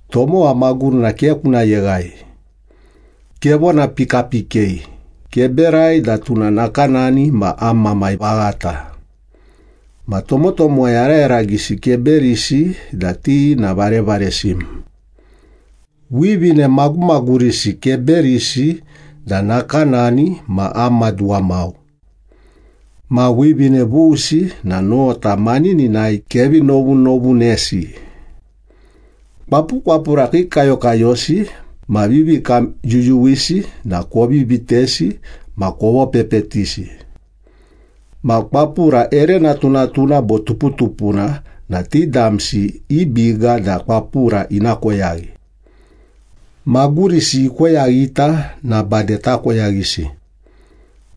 Tomowa magurina ke kuna yeghai. Kevona pikapikei, keberai da tuna nakanani ma am mamai vaghata. Ma tomotomowa yarayaragisi keberisi da ti na varevaresim. Wivine magumagurisi keberisi da nakanani ma am maduwa. Ma wivine vusi na nota manininai kevi novunovunesi. Kwapukwapura kiikayokayosi ma vivikamyuyuwisi na kovi vitesi ma kovopepetisi. Ma kwapura ere natunatuna bo tuputupuna na ti damsi i biga da kwapura ina koyaghi. Magurisi ikoyaghita na bade takoyaghisi.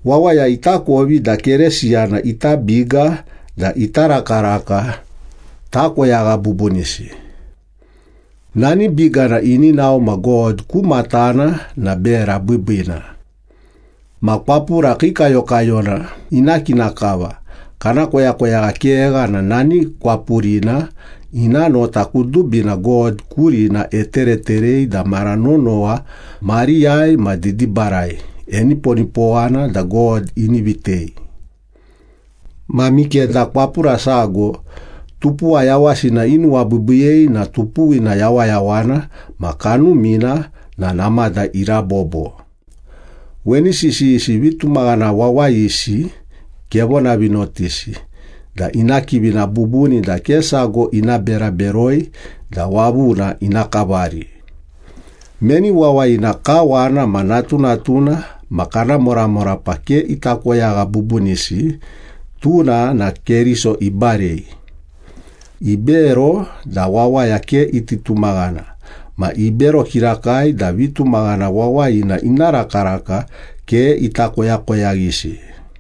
Wawaya itakovi da Keresiyana ita biga da ita rakaraka takoyagha bubunisi. Nani bigana ini nao ma God ku matana na bera biibiina. Ma kwapura kiikayokayona ina kina kava, kana koyakoyagha kegha na nani kwapurina ina nota kudubina God kurina etereterei da mara nonowa, mariyai ma didibarai, eniponipowana da God ini vitei. Ma mikeda kwapura sago tupuwa yawasina inuwabiibiiyei na tupuwina yawayawana ma kanumina na namada irabobo. Weni sisiyisi vitumaghana wawayisi kevonavinotisi da ina kivina bubuni da ke sago ina bera beroi da wavuna ina kavari. Meni wawayina kawana ma natunatuna ma kana moramorapa ke ita koyagha bubunisi, tuna na Keriso ibarei. Ibero da wawaya ke iti tumaghana, ma ibero kirakai da vitumaghana wawayina ina rakaraka ke ita koyakoyaghisi.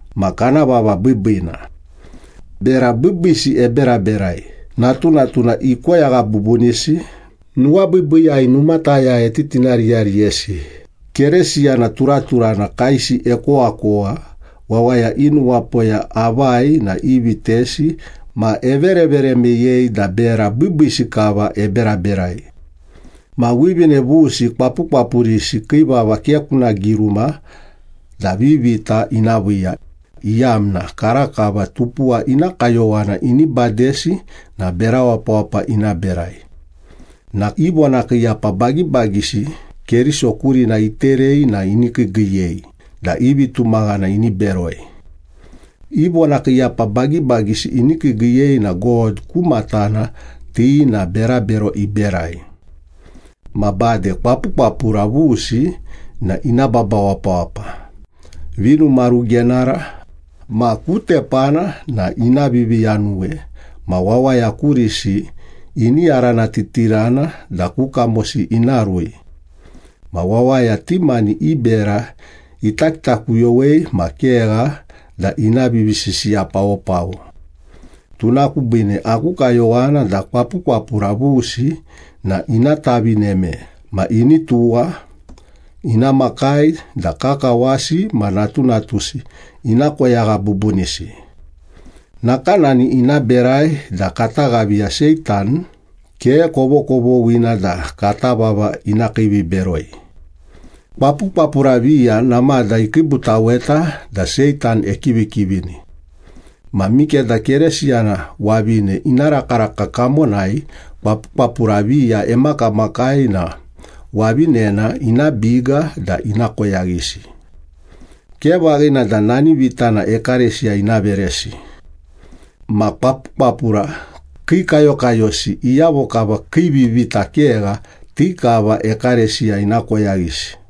ma kana vava biibiina. Bera biibiisi eberaberai, natunatuna ikoyagha bubunisi, nuwabiibiiyai numataya etitinariyariyesi, Kerisiyana turaturana kaesi ekowakowa, wawaya i nuwapoya avai na ivitesi ma everevere meyei da bera biibiisi kava eberaberai. Ma wivine vusi kwapukwapurisi kii vava ke kuna giruma da vivita ina viiya, iyamna karakava tupuwa ina kayowana ini badesi na bera wapawapa ina berai. Nakanani ina berai na i vonakiiyapa bagibagisi Keriso kurina iterei na ini kiigiiyei da i vitumaghana ini beroi. I vonakiiyapa bagibagisi ini kiigiiyei na God ku matana ti na berabero iberai. Ma bade kwapukwapura vusi na ina baba wapawapa, vinumarugenara ma ku tepana na ina viviyanuwe ma wawaya kurisi ini yaranatitirana da ku kamosi ina rui. Ma wawaya ti mani i bera ita kitakuyowei ma kegha da ina vivisisiyapawopawo. Tuna kubiine aku kayowana da kwapukwapura vusi na ina tavineme ma ini tuwa, ina makai da kakawasi ma natunatusi ina koyagha bubunisi. Nakanani ina berai da kata ghaviya Seitan ke kovokovoghina da kata vava ina kiiviberoi. Kwapukwapura viya namada ikiibutaweta da Seitan ekivikivini. Ma mikeda Keresiyana wavine ina rakaraka kamonai kwapukwapura viya emakamakai na wavinena ina biga da ina koyaghisi. Ke vaghina da nani vitana ekalesiya ina veresi. Ma kwapukwapura kiikayokayosi, iyavo kava kii vivita kegha, ti kava ekalesiya ina koyaghisi.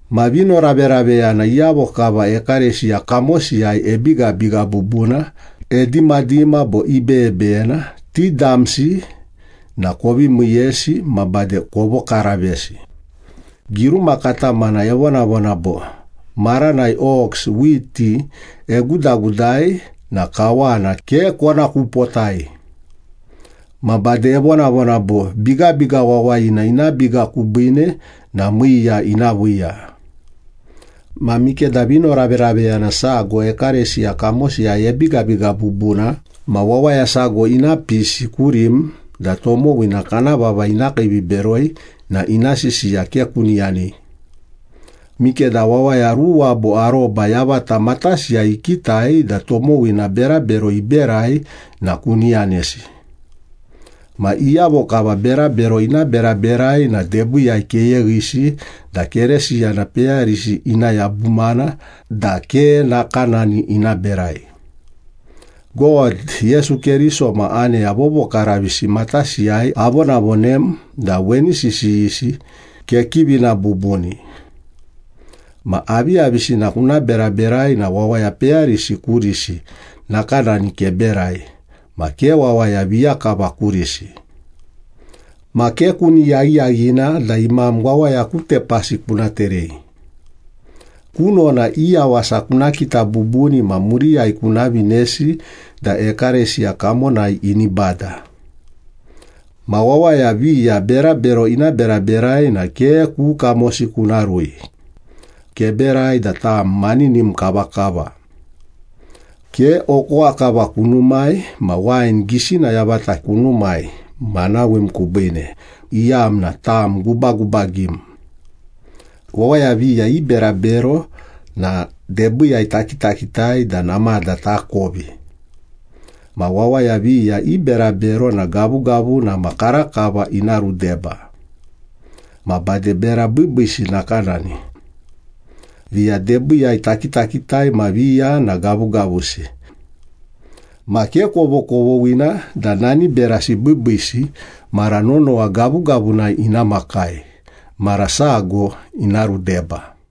Ma vinoraveraveyana, iyavo kava ekalesiya kamosiyai ebigabiga bubuna, edimadima bo ibeyebeyena, ti damsi na kovi miiyesi ma bade kovokaravesi. Giruma katamana evonavona bo, “Maranai ox whiti egudagudai na kawana ke kona kupotai.” ma bade evonavona bo, “Bigabiga wawayina ina biga kubiine na miiya ina viiya.” Ma mikeda vinoraveraveyana sago ekalesiya kamosiyai ebigabiga bubuna ma wawaya sago ina pisi kurim da tomowina kana vava ina kiiviberoi na ina sisiya ke kuni yanei. Mikeda wawaya ruwa bo aroba yavata matasiyai ikitai da tomowina berabero iberai na kuni yanesi. Ma iyavo kava berabero ina beraberai na debiiyai keyeghisi da Keresiyana peyarisi ina yabumana da ke nakanani ina berai. God, Yesu Keriso ma aneya vovokaravisi matasiyai avonavonem da weni sisiyisi kekivina bubuni. Ma aviyavisina kuna beraberai na wawaya peyarisi kurisi nakanani keberai, ma ke wawaya viya kava kurisi. Ma ke kuni yaghiyaghina da imam wawaya ku tepasi kuna terei. Kunona i yawasa kuna kita bubuni ma muriyai kuna vinei da ekalesiya kamonai ini bada. Ma wawaya viya berabero ina beraberai na ke ku kamosi kuna rui. Keberai da tam maninim kavakava. Ke okowa kava kunumai ma wain gisina yavata kunumai manawim kubiine, iyamna tam gubagubagim. Wawaya viya i berabero na debiiyai takitakitai da namada takovi. Ma wawaya viya i berabero na gavugavuna ma karakava ina rudeba. Ma bade bera biibiisi nakanani. Viya debiiyai takitakitai ma viya na gavugavusi. Ma ke kovokovoghina da nani berasi biibiisi mara nonowa gavugavunai ina makai, mara sago ina rudeba.